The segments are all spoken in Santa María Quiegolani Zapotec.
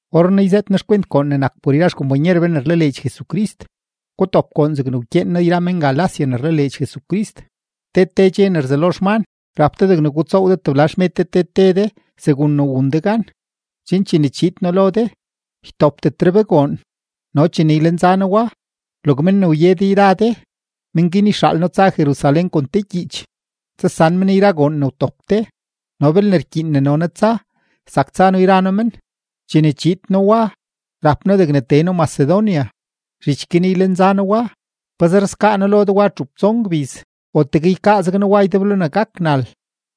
Orrenaa yzëët noo xkwent goon ne nak por yra xkompanyer be ne rlaleedx Jesucrist; gutop goon zegne wkyeen noo yra men-Galacia ne rlaleedx Jesucrist. Te te dxe ne rzelo xman, rap de degne gutsoow de tebla xmed de te te de segun ne wun de gan, chen chene chiid noo lo de, ytopdetre be goon. No chene ylenza noo wa, log men ne wye de yra de, men guin yxaal noo tsa men Jerusalén kon te gyiich, tsasan men yra goon ne wtop de. No belne rkyiin ne no noo tsa, zak tsa noo yra noo men. Chene chiid noo wa, rap noo degne tee noo Macedonia, zhich guin ylenza noo wa. Pazer skaa noo lo de wa txup tson gbiz o tegue ykaa zeg noo wa ydeblo ne gak nal,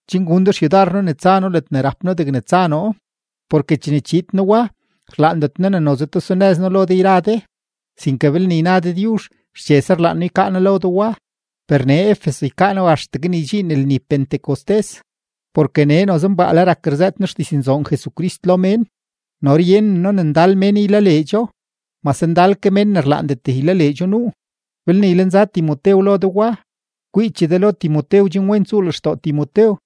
chen gun de xyudar noo ne tsa noo ledne rap noo degne tsa noo. Porke chene chiid noo wa, rlaandet noo ne noze tesunëz noo lo de yra de, sinke belne yna Dëdyuzh, xchese rlaan noo ykaa noo lo de wa. Per nee Efeso ykaa noo axtegue ne ydxiin lni Pentecostés, porke nee noze mbaale rak rzëët noo xdiznzoon Jesucrist lo mén, no ryenen noo ne ndal mén ylaleedxo, mase ndal ke mén ne rlaandet ylaleedxo nuu. Belne ylenza Timotew lo de wa, kwiiche de lo Timotew chen wen tsuu lextoo Timotew,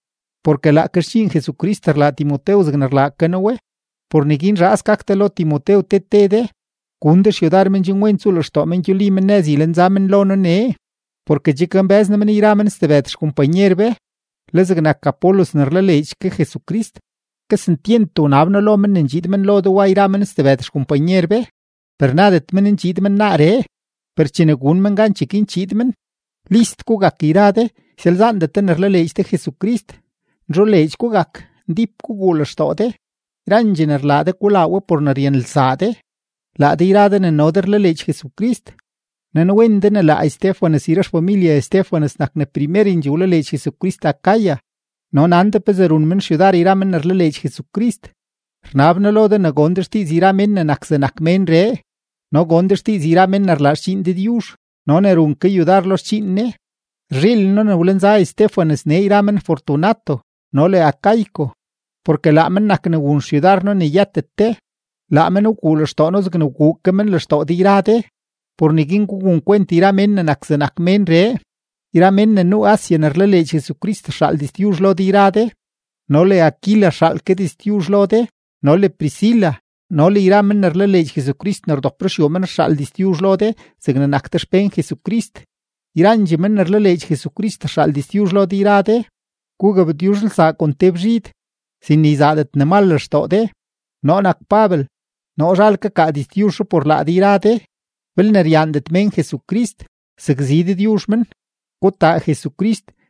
porke laake xdxiin Jesucrist rlaa Timotew zegne rlaa ke noo we. Por neguin zhaas gak de lo Timotew te te de; gun de xyudar men chen wen tsuu lextoo men gyuli men nëz ylenza men lo noo nee, porke che kambë́z noo men yra men stebëd xkompanyer be. Le zegnak Apolos ne rlaleedx ke Jesucrist, kesentyent wnab noo lo men ne ndxiid men lo de wa yra men stebëd xkompanyer be, per nadet men ndxiid men naaree, per chene gun men gan, cheguin chiid men. List gugak yra de; ysalzaandet de ne rlaleedx de Jesucrist; nzholeedx gugak; ndíp guguu lextoo de. Yrandxee ne rlaa de, gulaa we por ne ryanelsaa de. Laa de yra de ne no de rlaleedx Jesucrist, nanwen de ne laa Estéfanas yra xfamilye Estéfanas nak ne primerendxee wlaleedx Jesucrist Acaya no nan de pezee run men xyudar yra men ne rlaleedx Jesucrist. Rnab noo lo de ne gon de xdiiz yra men ne nak zegnak ménree no gon de xdiiz yra men ne rlaa xdxiin Dëdyuzh no ne run ke yudar lo xdxiin Ne. Rzhiilen noo ne wlenza Estéfanas nee yra men Fortunato no le Acaico, porke laa men nak ne wun xyudar noo ne yëtet de. Laa men wguu lextoo noo zegne wguu ke men lextoo de yra de. Por neguin gugun kwent yra mén ne nak zegnak menree. Yra mén ne nuu Asia ne rlaleedx Jesucrist rxaal diztyuzh lo de yra de, no le Aquila rxaal ke diztyuzh lo de no le Priscila no le yra men ne rlaleedx Jesucrist ne rdop ruxyuu men rxaal diztyuzh lo de zegne nak de xpén Jesucrist. Yrandxee men ne rlaleedx Jesucrist rxaal diztyuzh lo de yra de. Gugabtyuzhelsaa kon te bzhid, sin ne yzaadet ne mal lextoo de. Noo nak Pabel, noo zhal kakaa diztyuzhree por laa de yra de. Belne ryaandet mén Jesucrist, sakzi Dëdyuzh men. ¡Gutaa Jesucrist!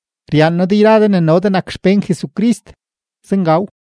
Ryaan noo de yra de ne no de nak xpén Jesucrist. Zengaw.